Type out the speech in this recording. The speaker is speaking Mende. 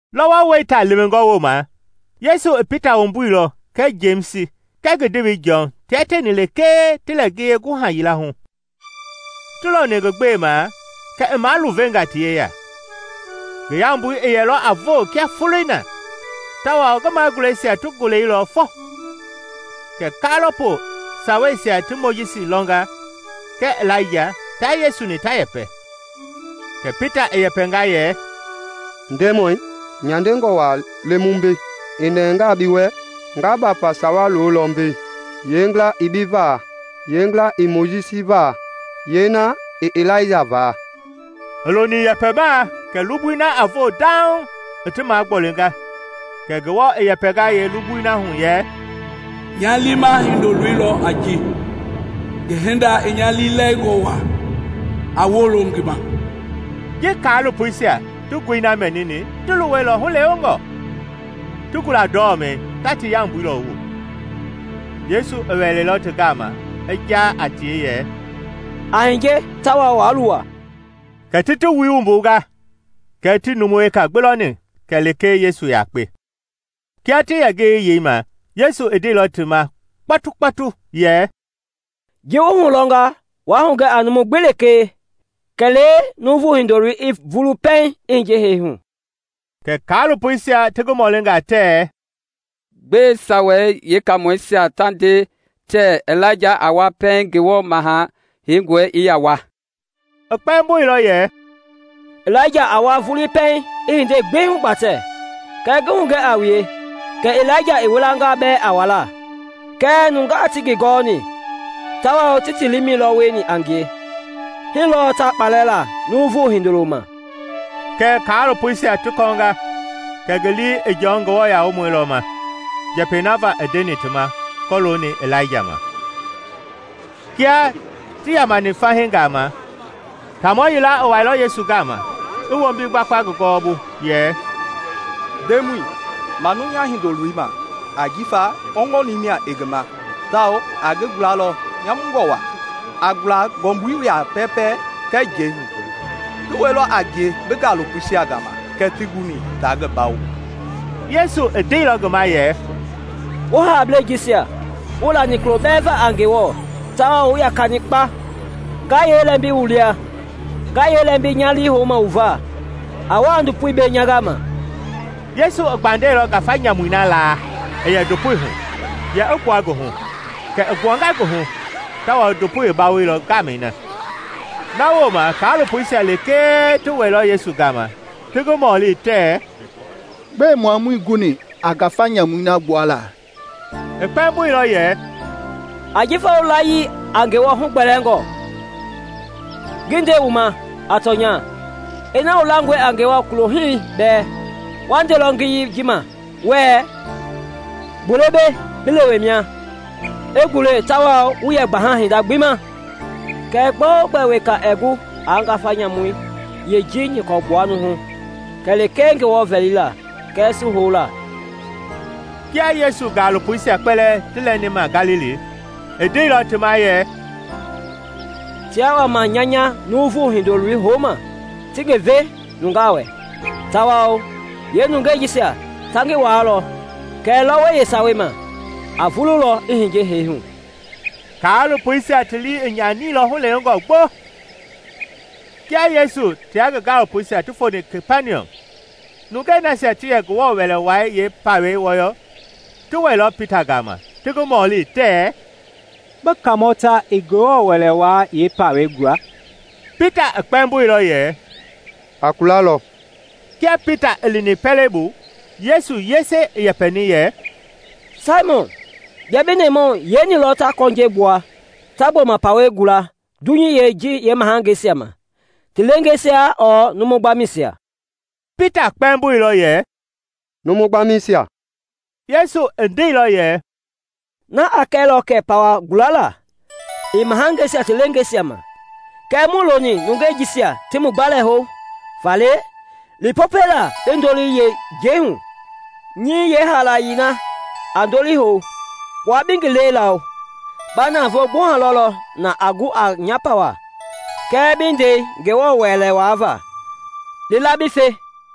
Lɔwɔ wɛita lewengɔ wooma Yesu i Pita wumbuilɔ kɛɛ Jemisi kɛɛ ngi ndewei Jɔn tia tieni lekee ti lɛ ngiye guha yila hu. Ti loni ngi gbema kɛ i maluvenga ti yeya; ngi yambui i yɛlɔ a voo kia foloi na tawao ngi maguleisia ti goleilɔ fofo. Kɛ kaalopo saweisia ti Mojisi lɔnga kɛɛ Ilaija tia Yesu-ni ta yɛpɛ. Kɛ Pita i yɛpɛnga yɛ, “Ndemɔi, nyandengɔ waa le mu mbei; i nɛngaa bi wɛ nga bafa sawa lolɔ mbei, yeengila i bi va, yeengila i Mojisi va, yeena i Ilaija va.” I loni yɛpɛmaa kɛ lugbui na a voo dauŋ i ti magbolinga, kɛ Ngewɔ i yɛpɛnga yeelugbui hu yɛ, “Nya liima Hindoloi lɔ a ji, ngi hinda i nya liilɛlingɔ waa; a wolo ngi ma.” Ji kaalopoisia ti ngoi na mɛnini ti luwɛilɔ hulewengɔ, ti gula ndɔmɛi ta ti yambui lɔwu. Yesu i wɛilɔ ti gama i jaa a tie yɛ, “A hiye tawao waa luwa.” Kɛ ti ti wui wumbunga kɛɛ tii numu weka gbi lɔni kɛlee Yesu yakpe. Kia ti yɛ ngiyei yeima Yesu i ndeilɔ ti ma kpɔtukpɔtu yɛ, “Ji wu hulɔnga waa hugɛ a numu gbi kɛlee Numu Hindoloi a vulu pɛiŋ i hiye hee hu.” Kɛ kaalopoisia ti ngi mɔlinga tɛɛ, “Gbɛe Sawei Yeekaamɔisia ta nde tɛɛ Ilaija a wa pɛiŋ Ngewɔ Maha Heingɔi i yaa wa?” I kpɛmboilɔ yɛ, “Ilaija a wa vulii pɛiŋ i hindei gbi hugbatɛ. Kɛɛ ngi hugɛ a wue kɛ Ilaija i wilanga bɛɛ a walaa kɛɛ nungaa tii ngi gɔɔni tawao ti ti liimɛi lɔ wieni a ngie. Hii lɔɔ ta kpalɛ la Numu Hindoloi ma.” Kɛ kaalopoisia ti kɔɔnga kɛ ngi lii i Jɔn Nguamɔi lɔ ma njɛpɛi na va i ndeni ti ma kɔlooni Ilaija ma. Kia ti yamani fahii gama, taamɔ yila i wɛilɔ Yesu gama, i wombi gbakpa ngi gɔwɔbu, yɛ, “Ndemɔi, manu nya hindoloi ma, ajifa kpɔgbɔnii mia i ngi ma tawao a ngi gulalɔ nyamungɔ waa, a gula ngɔmbui ya pɛɛpɛ kɛɛ njɛi hu. Ngi wɛilɔ a ngie bi gaalopoisia gama kɛɛ tii guni taa ngi bawo.” Yesu i ndeilɔ ngi ma yɛ, “Wu haablei jisia wuii lani kulo bɛɛ va a Ngewɔ tawao wu yakani kpa! Nga yee lɛmbi wu lia? Nga yee lɛmbi nya lii houma wu va? A wa a ndopoi mbei nya gama.” Yesu i gbandɛilɔ ngafa nyamui na laa i yɛ ndopoi hu yɛ i gbua ngi hu. Kɛ i gbuanga ngi hu tawao ndopoi i bawoilɔ ngaamɛi na. Na wooma kaalopoisia lekee ti wɛilɔ Yesu gama ti ngi mɔli tɛɛ, “Gbɛe mua muii guni a ngafa nyamui na gbuala?” I kpɛmboilɔ yɛ, “Ajifa wu layii a Ngewɔ hugbɛɛngɔ. Ngi nde wu ma a tɔnya, ina wu langɔe a Ngewɔ kulohii bɛɛ, wa ndelɔ ngiyei ji ma wɛɛ, ‘Gule mbei bi lewe mia,’ i gule; tawao wuii yɛ gbaha hinda gbi ma. [ “Kɛɛ gbɛogbɛ weka ɛɛ gu aa ngafa nyamui yee ji nyɔkɔ gbua numu hu kɛlee Ngewɔ vɛlilaa lekee kɛɛ su houla.”] Kia Yesu gaalopoisia kpɛlɛɛ ti lɛni ma Galili, i ndeilɔ ti ma yɛ, “Tiaa wama nya nya Numu Hindoloi houma ti ngi ve nungaa wɛ, tawao yeenungeisia ta ngi waalɔ; kɛɛ lɔwɔi yeesawei ma a vululɔ i hiye hee hu.” Kaalopoisia ti lii i nyanilɔ hulewengɔ gbo. Kia Yesu tia ngi gaalopoisia ti foni Kapaniɔm nungei nasia ti yɛ Ngewɔ Wɛlei Wai yeepawei wɔyɔ ti wɛilɔ Pita gama ti ngi mɔli tɛɛ, “Bi Kaamɔ ta ɛɛ Ngewɔ Wɛlei Wai yeepawɛi gula?” Pita i kpɛmboilɔ yɛ, “A kulalɔ.” Kia Pita i lini pɛlei bu, Yesu yese i yɛpɛni yɛ, “Saimɔn, bia bi nɛmahu yeeni lɔ ta kɔnjɛi gbua ta gbɔma pawɛi gula dunyei ji yeemahangeisia ma? Ti leengeisia ɔɔ numu gbamɛisia?” Pita kpɛmboilɔ yɛ, “Numu gbamɛisia.” Yesu i ndeilɔ yɛ, “Na i kɛilɔ kɛ pawa gulala ii mahangeisia ti leengeisia ma. Kɛɛ muii loni nungei jisia ti mu gbalɛ hou. Faale li Popɛi laa bi ndoli yei njɛi hu. Nyɛi yeehaalayei na a ndoli hou, kpua bi ngi lɛi lawo; ba navoo gbuha lɔlɔ na a gu a nya pawɛi kɛɛ bi ndɛi N gewɔ Wɛlei Wai va. Li la bi fe.”